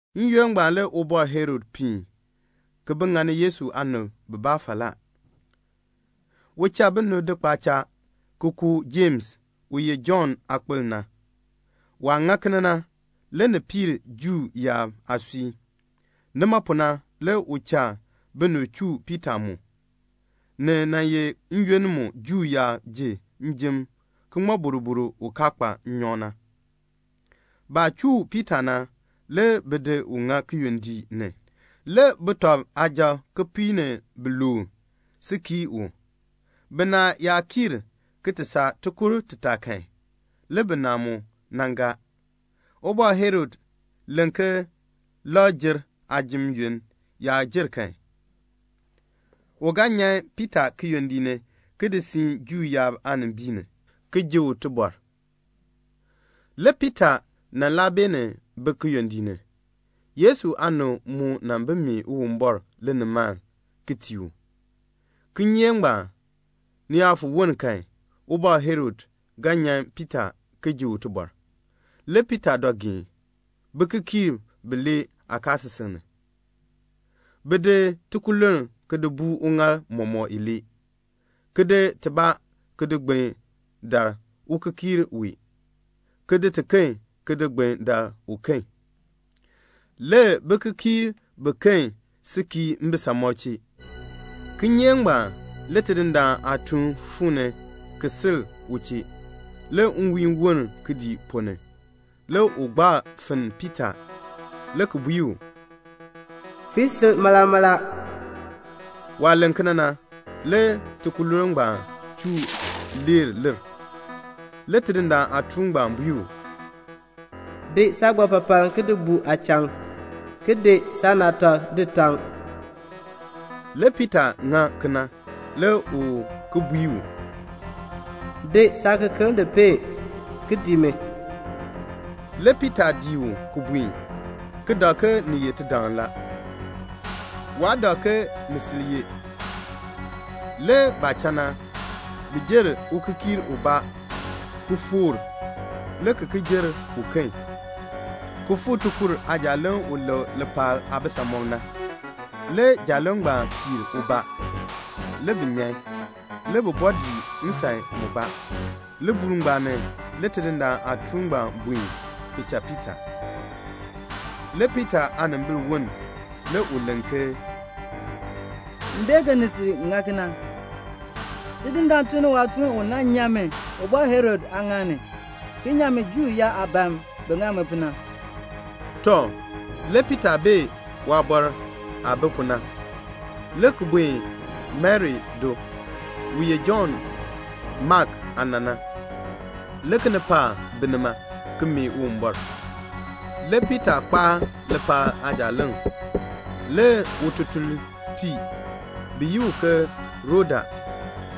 N-yoonn ngbaan le Ubɔr Herod piin ki bi ŋani Yesu aanib bibaa falaa. U cha binib di kpaacha ki ku Jems u ye Jɔnn aakpil na. Waah ŋa kena na le ni piir Juu yaab aasui. Nima pu na le u cha binib chuu Piita mu. (Ni nan ye n-yoonn mu Juu yaab ji njim ki ŋmɔ boroboro u kaa kpa nnyɔk na.) Baah chuu Piita na, le bi di u ŋa kiyondiik ni. Le sujatiib kipiik ni biluub si kii u. Binaa yaa kiir ki ti saa tikur titaa kan, le binaa mu nan gaa. Ubɔr Herod len ke Lakr-jer aajim yoonn yaa jer kan, u ga nyan Piita kiyondiik ni ki di siin Juu yaab aanimbiin ni, ki ji u tibɔr. Le Piita nan laa beenin bi kiyondiik ni. Yesu aanib mu nan bi mee Uwumbɔr linimaln, ki tii u. Kinyeek ngbaan, ni yaa fo woln kan, Ubɔr Herod ga nyan Piita ki ji u tibɔr. Le Piita dɔ geen bikikiirb bilee aakaasisik ni. Bi di tikululn ki di buu uŋaal mɔmɔk ilee, ki di tibaa ki di gbin dar ukikiir wee, ki di tiken ki di gbin dar uken. Le bikikiirb biken si kii mbisamɔb chee. Kinyeek ngbaan, le Tidindaan aatuun fuu ni ki sil u chee. Le nwiihn woln kidiik ponn ni. Le u gbaa finn Piita, le ki bui u, "Fii sil mala mala." Waah len kena na, le tikululn ngbaan chuu leer lir. Le Tidindaan aatuun ngbaan bui u, "Di saagbapapaln ki di buu aachaŋ, ki di saanaatak di taŋ." Le Piita ŋa kena. Le u ki bui u, "Di saakekeln di peen, ki dii mi." Le Piita dii u ki buen, ki dak ke ni ye tidaŋ la. Waa dak ke ni sil ye. Le baah cha na, bi jer ukikiir ubaa, ki ki foor, le ki ki jer uken, ki fuu tikur aajaaleŋ u lek lipaal aabisamɔb na. Le jaaleŋ ngbaan piir ubaa. Le bi nyan, le ki bɔɔ dii nsan mubaa. Libuul ngbaan ni le Tidindaan aatuun ngbaan buen, ki cha Piita. Le Piita aanimbil woln. Le u len ke, "M bee ke ni sil ŋa kena. Tidindaan tun ni waatuun u nan nyan mi Ubɔr Herod aaŋaal ni, ki nyan mi Juu yaab aah ban bin ŋa mi pu na." Tɔ, le Piita bee waabɔr aah bi pu na, le ki buen Mari do, u ye Jɔnn Mak aana na. Le kinipaak bi nima, ki mee Uwumbɔr. Le Piita kpaa lipaal aajaaleŋ. Le ututulnpii bi yi u ke Roda,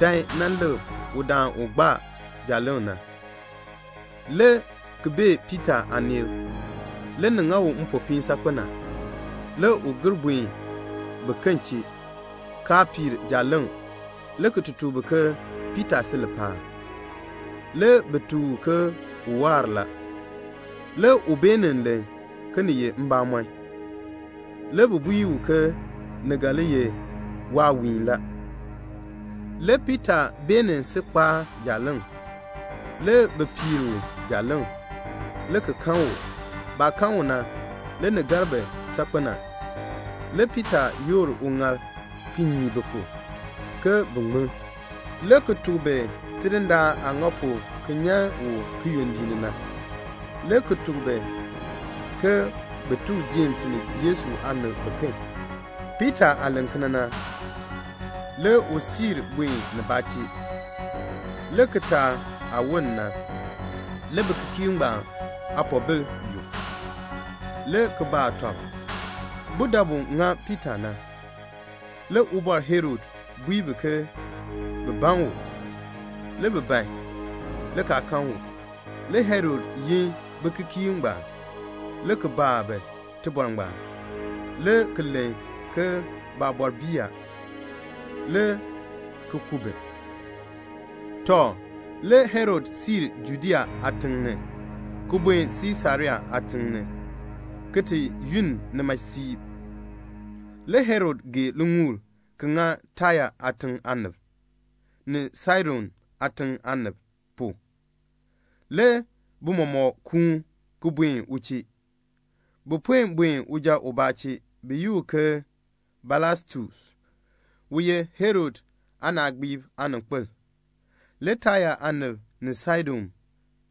dan nan lik udaan u kpaa jaaleŋ na, le ki bee Piita aaneel. Le ni ŋa u mpopiin saakpen a. Le u gir buen biken chee, kaa piir jaaleŋ, le ki ti tuk bi ke Piita si lipaal. Le bi tuk u ke u waar la. Le u beenin len ke ni ye mbamɔn. Le bi bui u ke ni ga li ye waawiin la. Le Piita beenin si kpaa jaaleŋ. Le bi piir u jaaleŋ, le ki kan u. Baah kan u na, le ni gar bi saakpen a. Le Piita yoor uŋaal ki nyii bi pu, ke bin ŋmin, le ki tuk bi Tidindaan aah ŋa pu ki nyan u kiyondiik ni na, le ki tuk bi ke bin tuk Jems ni Yesu aanib biken. Piita aah len kena na, le u siir buen nibaa chee. Le kitaak aah woln na, le bikikiirb ngbaan aapoobil yuk. Le bi baa tɔb budabu ŋa Piita na. Le Ubɔr Herod bui bi ke bin ban u. Le bi ban, le kaa kan u. Le Herod yin bikikiirb ngbaan, le ki baa bi tibɔr ngbaan, le ki len ke baabɔr bii, le ki ku bi. Tɔ, le Herod siir Judea aatiŋ ni, ki buen Siisarea aatiŋ ni, ki ti yunn nima siib. Le Herod gee liŋuul ki ŋa Taya aatiŋ aanib, ni Saidon aatiŋ aanib pu. Le bi mɔmɔk kuun ki buen u chee. Bi puen buen uja ubaa chee, bi yi u ke Blastus, u ye Herod aanaagbiib aaninkpil. Le Taya aanib ni Saidon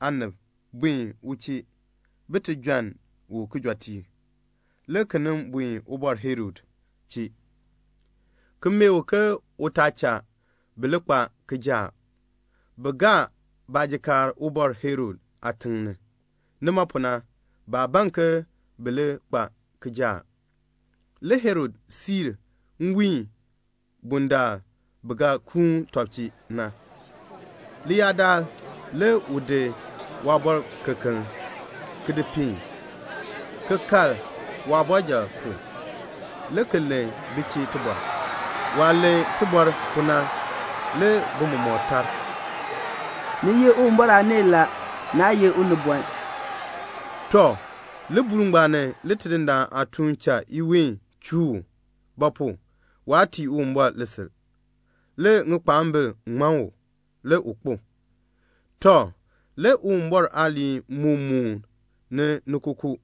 aanib buen u chee bin ti jɔnn u kijɔteek, le ki nin buen Ubɔr Herod chee, ki mee u ke u taa cha bi li kpa kijaak. Bi gaa baajikaar Ubɔr Herod aatiŋ ni. Nima pu na baa ban ke bi li kpa kijaak. Le Herod siin nwiin bundaln bi ga kuun tɔb na. Leyaadaal le u di waabɔrkekeln ki di peen, ki kal waabɔrjal pu, le ki len bi chee tibɔr. Waah len tibɔr pu na, le bi mɔmɔk tar, "Ni ye Uwumbɔr aaneel la, naa ye unibɔn." Tɔ, libuul ngbaan ni le Tidindaan aatuun cha iween chuu u; ba pu? waa tii Uwumbɔr lisil ngbaan. Le ŋikpaambil ŋman u, le u kpo. Tɔ, le Uwumbɔr aaliin moo mooni ni kookoo.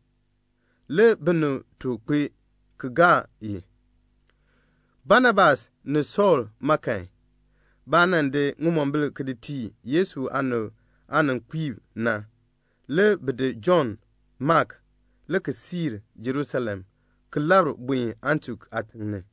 Le binib took kpee ki gaa i. Banabas ni Sɔɔl ma kan, baah nan di ŋimombil ki di tii Yesu aanib aaninkpiib na, le bi di Jɔnn Mak, le ki siir Jerusalem ki labr buen Antiok aatiŋ ni.